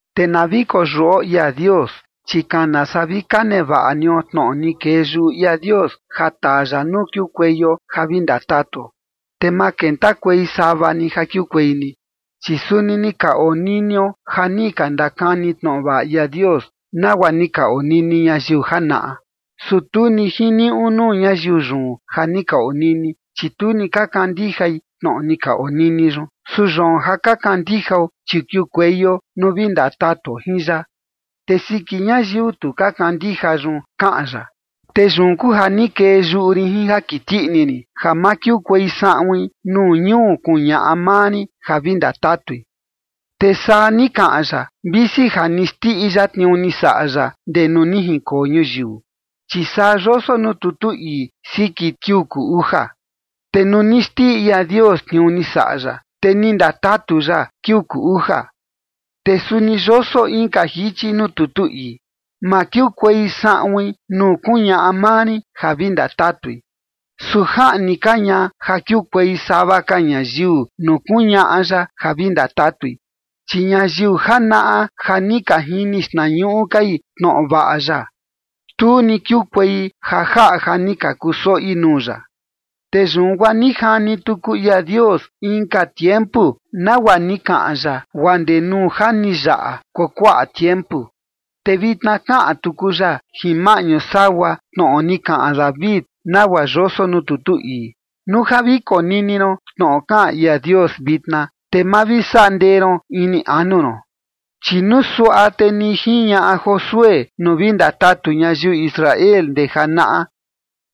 Te na vi koyuꞌo ia Dios, chi kana saa vi ka nevaꞌa nio tnoꞌo ni kee yuꞌu ia Dios ja taa ya nuu kiukueio ja vi ndatatuo, te ma kentakuei sava ni ja kiukuei ni. Chi suni ni ka oninio ja ni ka ndakani tnoꞌo vaꞌa ia Dios, nagua ni ka onini ñayiu janaꞌa. Su tu ni jiniuꞌu nuu ñayiu yun ja ni ka onini, chi tu ni ka kandijai tnoꞌo ni ka onini yun. Su yoon ja ka kandijao, chi kiukueio nuu vi ndatatuo jin ya. Te siki ñayiu tu ka kandija yun kaꞌan ya: Te yun kuu ja ni kee yuꞌu rin jin ja kiti ini rin, ja ma kiukuei saꞌuin nuu ñuu kuñaꞌa maa rin ja vi ndatatui. Te saa ni kaꞌan ya visi ja ni xndiꞌi ya tniuu ni saꞌa ya ndee nuu ni jinkoo ñuyiu. Chi saa yoso nuu tutu ii siki kiuu kuu uja: Te nuu ni xndiꞌi ia Dios tniuu ni saꞌa ya, te ni ndatatu ya kiuu kuu uja. Te suni yoso inka jichi nuu tutu ii: Ma kiukuei saꞌuin nuu kuñaꞌa maa rin ja vi ndatatui. Su jaꞌni ka ña ja kiukuei sava ka ñayiu nuu kuñaꞌa ya ja vi ndatatui, chi ñayiu janaꞌa ja ni ka jini xtnañuꞌu kai tnoꞌo vaꞌa ya, tu ni kiukuei ja jaꞌa ja ni ka kusoꞌi nuu ya. Te yun guaa ni jani tuku ia Dios inka tiempu, nagua ni kaꞌan ya guaa ndee nuu ja ni yaꞌa kuakuaꞌa tiempu, te vitna kaꞌan tuku ya jin maꞌñu sagua tnoꞌo ni kaꞌan David, nagua yoso nuu tutu ii: Nuu ja vi konini ron tnoꞌo kaꞌan ia Dios vitna, te ma vi saꞌa ndee ron ini anu ron. Chi nuu suaꞌa te ni jiñaꞌa Josué nuu vi ndatatu ñayiu Israel ndee janaꞌa,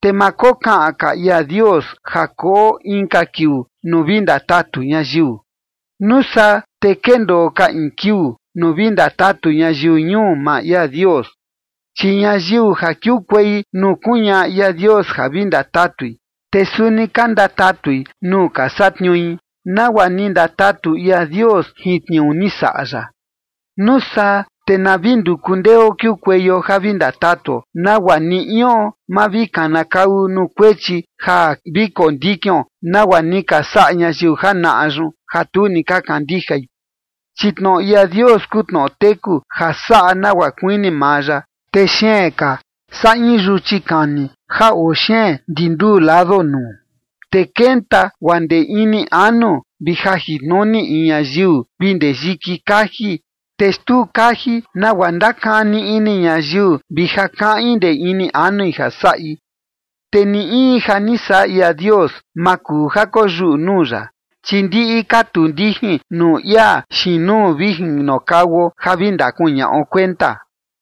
te ma kokaꞌan ka ia Dios ja koo inka kiuu nuu vi ndatatu ñayiu. Nuu saa te kendoo ka in kiuu nuu vi ndatatu ñayiu ñuu maa ia Dios, chi ñayiu ja kiukuei nuu kuñaꞌa ia Dios ja vi ndatatui, te suni ka ndatatui nuu ka satniui, nagua ni ndatatu ia Dios jin tniuu ni saꞌa ya. Nuu saa te na vi nduku ndeo kiukueio ja vi ndatatuo, nagua ni ion ma vi kanakau nuu kuechi ja vi kondikion nagua ni ka saꞌa ñayiu janaꞌa yun, ja tu ni ka kandijai. Chi tnoꞌo ia Dios kuu tnoꞌo teku ja saꞌa nagua kuini maa ya, te xeen ka saa in yuchi kani ja oo xeen ndi nduu lado nuu, te kenta guaa ndee ini anu vi jajintnuni in ñayiu vi ndee yiki kaji, te xtuu kaji nagua ndakani ini ñayiu vi ja kaꞌin ndee ini anui ja saꞌi. Te ni in ja ni saꞌa ia Dios ma kuu ja koyuꞌu nuu ya, chi ndiꞌi ka tuu ndijin nuu ia xiin nuu vi jinokauo ja vi ndakuñaꞌo kuenta.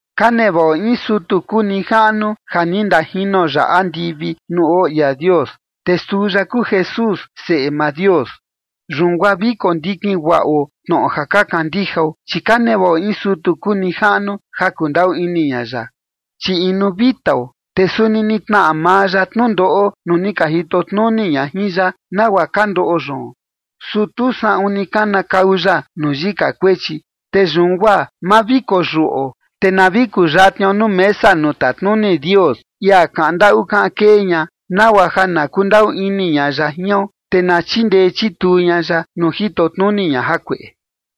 Ka nevaꞌo in sutu kuu nijaꞌnu ja ni ndajino ya andivi nuu oo ia Dios, te suu ya kuu Jesús, Seꞌe maa Dios. Yun guaa vi kondikin guaꞌo tnoꞌo ja ni ka kandijao. Chi ka nevaꞌo in sutu kuu nijaꞌnu ja kundaꞌu ini ña ya, chi inu vitao, te suni ni tnaꞌa maa ya tnundoꞌo nuu ni ka jito tnuni ña jin ya, nagua ka ndoꞌo yoon, su tu saꞌun ni kanakau ya nuu yika kuechi. Te yun guaa ma vi koyuꞌo, te na vi kuyatnio nuu mesa nuu tatnuni Dios, ia kaꞌan ndaꞌu kaꞌan kee ña, nagua ja na kundaꞌu ini ña ya jion, te na chindee chituu ña ya nuu jito tnuni ña jakueꞌe.